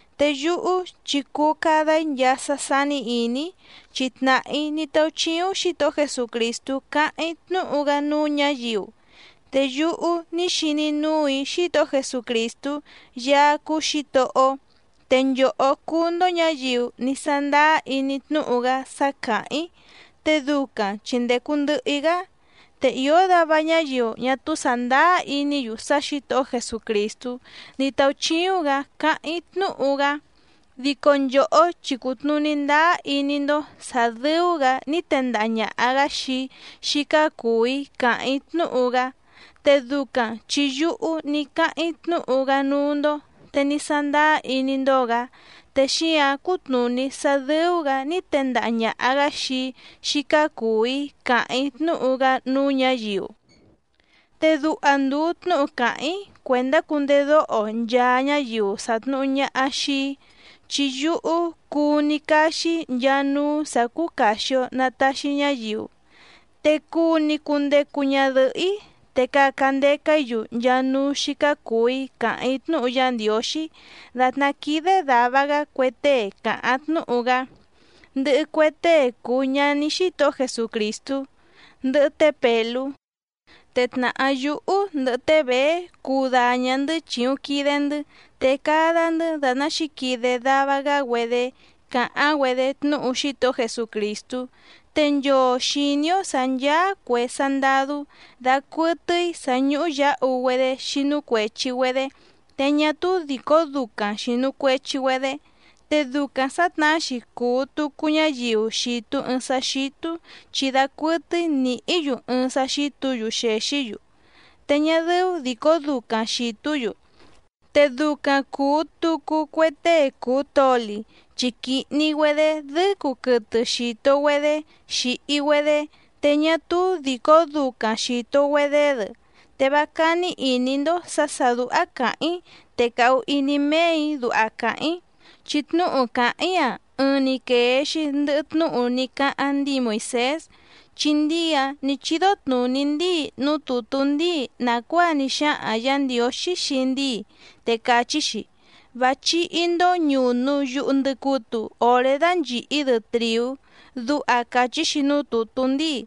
Te yúhú chi cuu cada‑í nchaa sá sání ìní‑í, chi tnàhá‑í ní táúchíúⁿ Xǐtohó Jesucrìstú cáháⁿ‑í tnúhu‑gá núú ñǎyiu. Te yúhú ní xiní núù‑í Xítohó Jesucrìstú Yaá cúú Xǐtohó‑ó te nchòhó cúú‑ndó ñǎyiu ní sándáá iní tnúhu‑gá sá càháⁿ‑í te ducaⁿ chi ndècu ndɨhɨ‑í‑gá. Te ìó dava ñáyiu ñá túú sàndáá iní‑yu sá Xǐtohó Jesucrìstú ní táúchíúⁿ‑gǎ cáháⁿ‑í tnúhu‑gá, dico nchòhó chi cùtnuní ndáá iní‑ndó sǎ dɨ́ú‑gǎ ní tendaha ñàha‑gá xii‑í xícá cùu‑í càháⁿ‑í tnúhu‑gá, te ducaⁿ chi yúhú ní cáháⁿ‑í tnúhu‑gá núú‑ndó te ní sándáá iní‑ndó‑gǎ te xíǎⁿ cútnùní sá dɨ́ú‑gǎ ní tendaha ñàha‑gá xii‑í xícá cùu‑í càháⁿ‑í tnúhu‑gá núú ñǎyiu. Te duha ndùu tnúhu càháⁿ‑í cuèndá cundedóho nchaa ñáyiu sàtnuhu ñaha xii‑í. Chi yúhú cuu‑ni caxi‑í nchaa núú sǎ cúú càxi‑o na taxi ñáyiu. Te cuu‑ni cundecu ñadɨ̀hɨ́‑í te caca ndeca‑í‑yu nchaa núú xícá cùu‑í càháⁿ‑í tnúhu Yá Ndiǒxí dàtná quídé dàva‑gá cue tée càháⁿ tnúhu‑gá, ndɨhɨ cue tée cùu ñaní Xítohó Jesucrìstú, ndɨhɨ té Pèlú. Te tnàhá yúhú ndɨhɨ té Bèé cuu daña‑ndɨ̌ chìuⁿ quide‑ndɨ́ te cada‑ndɨ́ dàtná xǐquide dava‑gá‑güedé càháⁿ‑güedé tnúhu Xítohó Jesucrìstú. Te nchoo xìní‑ó sǎ ncháá cuè sandadú dacuɨtɨ́í sǎ ñúhú yǎhu‑güedé xínú cuèchi‑güedé, te ñá túú dìcó ducaⁿ xìnu cuechi‑güedé. Te ducaⁿ sǎtnahá‑xi cùu tucu ñáyiu xìtu ɨɨⁿ sá xítú chi dacuɨtɨ́í nìhí‑yu ɨɨⁿ sá xítǔ‑yu xèxí‑yu, te ñá dɨ́ú dìcó ducaⁿ xìtú‑yu. Te ducaⁿ cùu tucu cue tée cùu toli chi quìhni‑güedé dɨ́cu quɨtɨ xìto‑güedé xìhi‑güedé te ñá túú dìcó ducaⁿ xìto‑güedé‑dɨ. Te vá cání ìní‑ndó sǎ sà dúhá càháⁿ‑í te càhu iní méè‑í duha càháⁿ‑í, chi tnúhu càháⁿ‑í‑a ɨɨⁿ‑ni quèe‑xi ndɨhɨ tnúhu ní cáháⁿ ndíi Moìsés. Chi ndíi‑áⁿ nǐ chídó tnùní ndíi núú tùtú ndíi nàcuáa ní xáhaⁿ Yǎ Ndiǒxí xii ndíi, te càchí‑xi: “Vá chíhí‑ndó ñùnu yuhu ndɨcutu oré dánchìhí‑dɨ trìú”, duha càchí‑xi núú tùtú ndíi.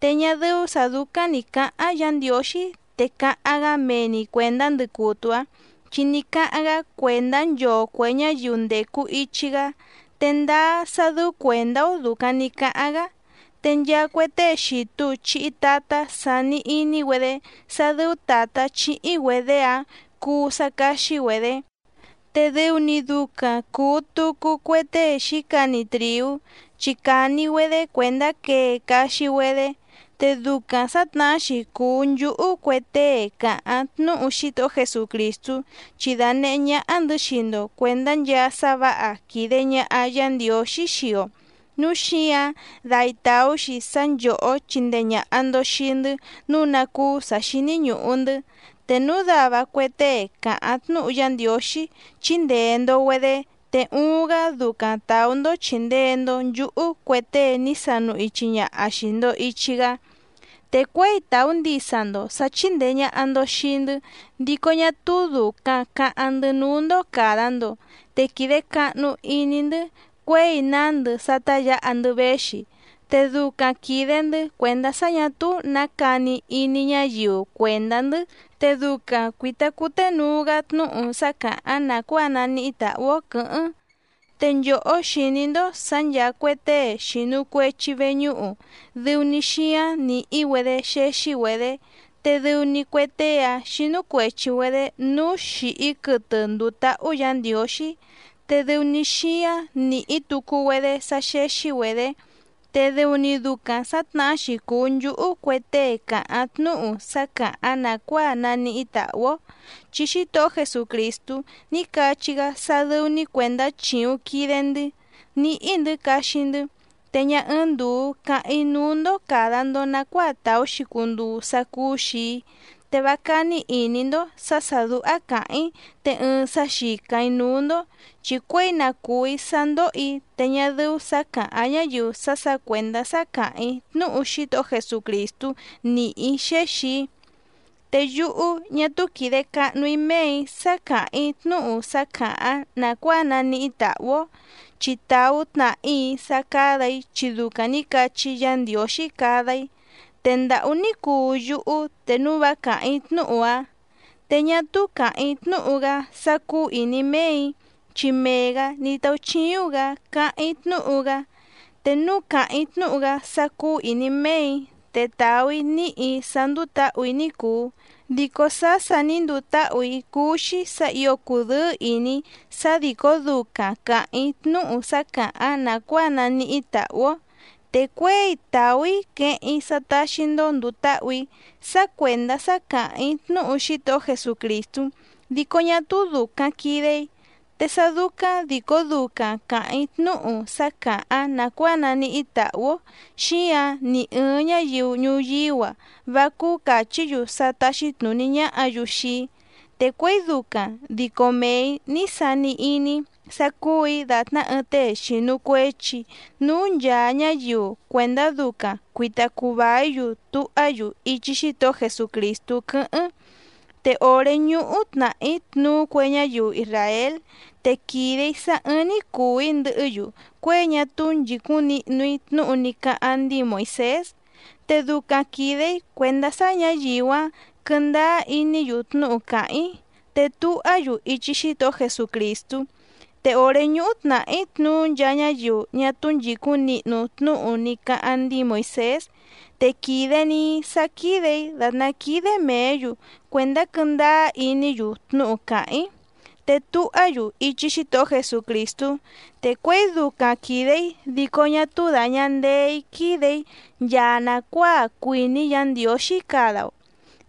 Te ñá dɨ́ú sǎ dúcáⁿ nǐ cáháⁿ Yǎ Ndiǒxí te càháⁿ‑gá mee‑ni cuèndá ndɨcutu‑áⁿ. Chi ní cáháⁿ‑gá cuèndá nchoo cuè ñáyiu ndècu ichi‑gá, te ndáá sá dɨ́ú cuèndá‑ó dùcaⁿ ní cáháⁿ‑gá. Te nchaa cue tée xìtu chihi tatá sàni iní‑güedé sá dɨ́ú tàtá chíhí‑güedě‑áⁿ cuu sá cáxí‑güedě, te dɨu‑ni ducaⁿ cùu tucu cue tée xǐcani trìú chi càni‑güedé cuèndá quee caxi‑güedé. Te ducaⁿ sǎtnahá‑xi cùu nchúhú cue tée càháⁿ tnúhu Xítohó Jesucrìstú, chi dànehé ñáhá‑ndɨ̌ xii‑ndo cuèndá nchaa sá vǎha quìde ñaha Yá Ndiǒxí xii‑o, núu xíǎⁿ dai tàú‑xi sá nchòhó chindee ñàha‑ndo xii‑ndɨ́ nǔu ná cúú sǎ xíní ñùhu‑ndɨ́. Te núu dava cue tée càháⁿ tnúhu Yá Ndiǒxí chíndèe‑ndo‑güedé, te uuⁿ‑gá ducaⁿ tàú‑ndó chìndee‑ndo nchúhú cue tée ní sanu ichi ñaha xìi‑ndo ichi‑gá. Te cuěi tàú ndisa‑ndo sǎ chíndèe ñaha‑ndo xii‑ndɨ́ dico ñá túú dùcaⁿ caháⁿ‑ndɨ́ núú‑ndó càda‑ndo, te quìde cahnu iní‑ndɨ́ cuěi nándɨ sá tá yǎha‑ndɨ́ véxi. Te ducaⁿ quìde‑ndɨ́ cuèndá sá ñà túú nǎ cani iní ñáyiu cuèndá‑ndɨ́ te ducaⁿ cuìta cuténuu‑gá tnúhu sá càháⁿ nàcuáa naníhí tàhú‑ó quɨ̌hɨ́ⁿ. Te nchòhó xìní‑ndó sǎ ncháá cuè tée xìnu cuechi veñúhu dɨu‑ni xíáⁿ nìhí‑güedé xéxí‑güedě, te dɨu‑ni cue tée‑áⁿ xínú cuèchi‑güedé núú xìhí quɨtɨ ndùu táhú Yǎ Ndiǒxí, te dɨu‑ni xíáⁿ nìhí tucu‑güedé sá xéxí‑güedě. Te dɨu‑ni ducaⁿ sǎtnahá‑xi cùu nchúhú cue tée càháⁿ tnúhu sá càháⁿ nàcuáa naníhí tàhú‑ó, chi Xítohó Jesucrìstú ní cachí‑gá sá dɨ́ú‑ní cuèndá chìuⁿ quide‑ndɨ́ níhí‑ndɨ̌ caxi‑ndɨ́. Te ñá ɨ́ɨ́ⁿ ndùu cáháⁿ‑í núú‑ndó càda‑ndo nacuáa tàú‑xi cunduu sá cúú‑xì‑í, te vá cání ìní‑ndó sǎ sà dúhá càháⁿ‑í te ɨɨⁿ sá xìcáⁿ‑í núú‑ndó. ¡Chi cuěi na cùú‑í sá ndóhò‑í te ñá dɨ́ú sǎ càháⁿ ñáyiu sá sǎ cuèndá sá càháⁿ‑í tnúhu Xítohó Jesucrìstú nìhí‑í xéxì‑í! Te yúhú ñá túú quìde cahnú‑í méè‑í sá càháⁿ‑í tnúhu sá càháⁿ nàcuáa naníhí tàhú‑ó, chi tàú tnàhá‑í sá cádà‑í chi ducaⁿ nǐ cachí Yǎ Ndiǒxí cada‑í. ¡Te ndàhú ní cuu yúhú te núu vá càháⁿ‑í tnúhu‑áⁿ! Te ñá túú càháⁿ‑í tnúhu‑gá sá cúú ìní méè‑í chi mee‑gǎ ní táúchíúⁿ‑gǎ cáháⁿ‑í tnúhu‑gá. Te núu càháⁿ‑í tnúhu‑gá sá cúú ìní méè‑í te tàú‑í níhì‑í sá ndúú tǎhù‑í ní cùu. Dico sá sà ní nduu táhù‑í cúú‑xí sǎ ǐo cùdɨ́ɨ́ ìní‑í sá dìcó ducaⁿ càháⁿ‑í tnúhu sá càháⁿ nàcuáa naníhí tàhú‑ó. Te cuěi tàú‑í queheⁿ‑í sá táxí‑ndó ndùu táhù‑í sá cuèndá sá càháⁿ‑í tnúhu Xítohó Jesucrìstú, dico ñá túú dùcaⁿ quide‑í. Te sá dúcáⁿ dìcó ducaⁿ càháⁿ‑í tnúhu sá càháⁿ nàcuáa naníhí tàhú‑ó, xíǎⁿ ni ɨ̀ɨⁿ ñáyiu ñuyíú‑a vá cúú càchí‑yu sá táxí tnùní ñáhǎ‑yu xii‑í, te cuěi ducaⁿ dico mee‑ǐ ní sani iní‑í sá cúù‑í dàtná ɨɨⁿ tée xìnu cuechi núú nchàa ñáyiu cuèndá ducaⁿ cuìta cuu vaí‑yu tuhá‑yu ichi Xítohó Jesucrìstú quɨ́hɨ́ⁿ. Te òré ñúhú tnàhí tnuú cue ñáyiu isràél te quìde‑í sá ɨ́ɨ́ⁿ‑ní cùu‑í ndɨhɨ́‑yu cuěi ñá túú nchìcúⁿ nihnu‑í tnúhu ní cáháⁿ ndíi Moìsés, te ducaⁿ quìde‑í cuèndá sá ñǎyiu‑áⁿ quɨ̀ndáá iní‑yu tnúhu càháⁿ‑í te tuhá‑yu ichi Xítohó Jesucrìstú. Te òré ñúhú tnàhí tnuú nchaa ñáyiu ñá túú nchìcúⁿ nihnu tnúhu ní cáháⁿ ndíi Moìsés, te quìde‑ni‑í sá quídè‑í dàtná quídé mèé‑yu cuèndá quɨ́ndáá iní‑yu tnúhu càháⁿ‑í, te tuhá‑yu ichi Xítohó Jesucrìstú. Te cuěi ducaⁿ quìde‑í dico ñá túú dàña ndeé‑í quídè‑í nchaa nàcuáa cuìní Yǎ Ndiǒxí cada‑o,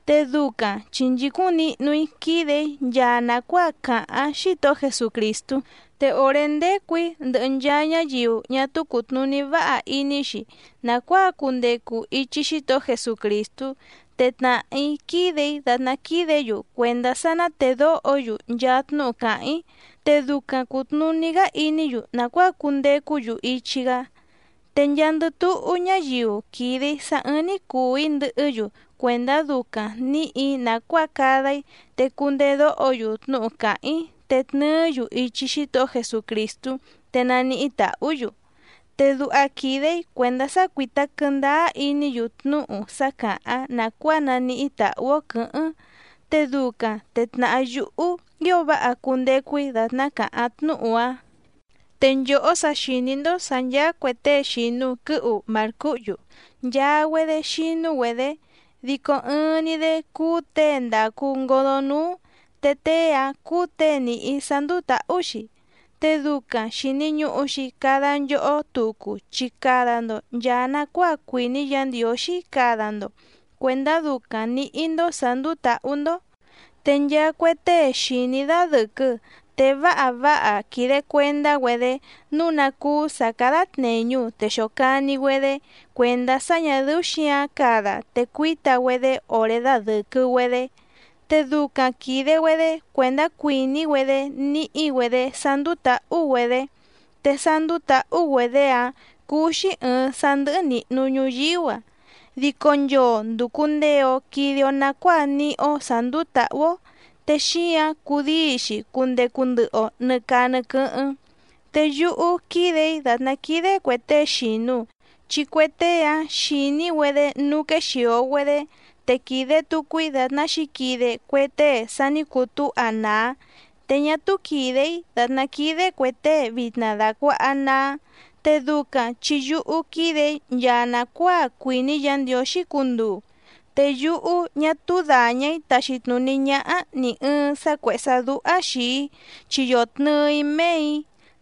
te ducaⁿ chi nchìcúⁿ nihnu‑í quídè‑í nchaa nàcuáa càháⁿ Xítohó Jesucrìstú. Te òré ndécù‑í ndɨhɨ nchaa ñáyiu ñá túú cùtnuní váha iní‑xi nàcuáa cundecu ichi Xítohó Jesucrìstú, te tnàhá‑í quídè‑í dàtná quídě‑yu cuèndá sá ná tèdóho‑yu nchaa tnúhu càháⁿ‑í te ducaⁿ cùtnuní‑gá iní‑yu nàcuáa cundecú‑yu ichi‑gá. Te nchaandɨ túhú ñáyiu quìde‑í sá ɨ̀ɨⁿ‑ni cuu‑í ndɨhɨ́‑yu cuèndá ducaⁿ nǐhì‑í nàcuáa cada‑í te cundedóho‑yu tnúhu càháⁿ‑í te tnɨɨ́‑yu ichi Xítohó Jesucrìstú te naníhí tàhú‑yu. Te duha quìde‑í cuèndá sá cuítá quɨ̀ndáá iní‑yu tnúhu sá càháⁿ nàcuáa naníhí tàhú‑ó quɨ̌hɨ́ⁿ, te ducaⁿ te tnàhá yúhú ío váha cundecu‑í dàtná càháⁿ tnúhu‑áⁿ. Te nchòhó sa xìní‑ndó sǎ ncháá cuè tée xìnu quɨ́hu màrcúhyú nchaa‑güedé xínú‑güedě, dico ɨɨⁿ‑ni‑dé cúú těe ndàcu ngodó núú te tée‑áⁿ cúú těe nìhí sá ndúú tǎhú‑xi, te ducaⁿ xìni ñuhu‑xi cada nchohó tucu chi cada‑ndo nchàa nacuáa cuìní Yǎ Ndiǒxí cada‑ndo cuèndá ducaⁿ nǐhí‑ndó sǎ ndúú tǎhú‑ndó. Te nchaa cue tée xìní dadɨ̀quɨ te váha váha quìde cuendá‑güedé nǔu ná cúú sǎ cádá tnèñu te xòcani‑güedé cuèndá sá ñà dɨ́ú xǐǎⁿ cada te cuíta‑güedé òré dadɨ̀quɨ‑güedé. Te ducaⁿ quìde‑güedé cuèndá cuìní‑güedé níhí‑güedě sá ndúú tǎhú‑güedě, te sá ndúú tǎhú‑güedě‑áⁿ cúú‑xí ɨ̀ɨⁿ sá ndɨ́hɨ́ nìhnu ñuyíú‑a. Dico nchoo ndùcu ndee‑o quide‑o nacuáa níhí‑ó sǎ ndúú tǎhú‑ó, te xíǎⁿ cudíi‑xi cundecu ndɨhɨ‑o nɨ̀ caa nɨ quɨ́hɨ́ⁿ. Te yúhú quídè‑í dàtná quídé cuè tée xìnu, chi cue tée‑áⁿ xìní‑güedé núú quéxìo‑güedé, te quìde tucu‑í dàtná xǐquide cue tée sa ní cutúha nàá, te ñá túú quìde‑í dàtná quídé cuè tée vitna dàcuaha naá. Te ducaⁿ chi yúhú quídè‑í nchaa nàcuáa cuìní Yǎ Ndiǒxí cunduu. Te yúhú ñá túú dàña‑í taxi tnùní ñáhá nì ɨɨⁿ sá cuèhé sá dúhá xìi‑í chi yòtnɨɨ‑í méè‑í.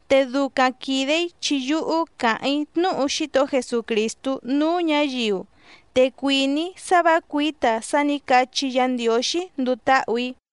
Te ducaⁿ quìde‑í chi yúhú càháⁿ‑í tnúhu Xítohó Jesucrìstú núú ñǎyiu, te cuìní‑í sá vǎ cuǐta sá nǐ cachí Yǎ Ndiǒxí nduu táhù‑í.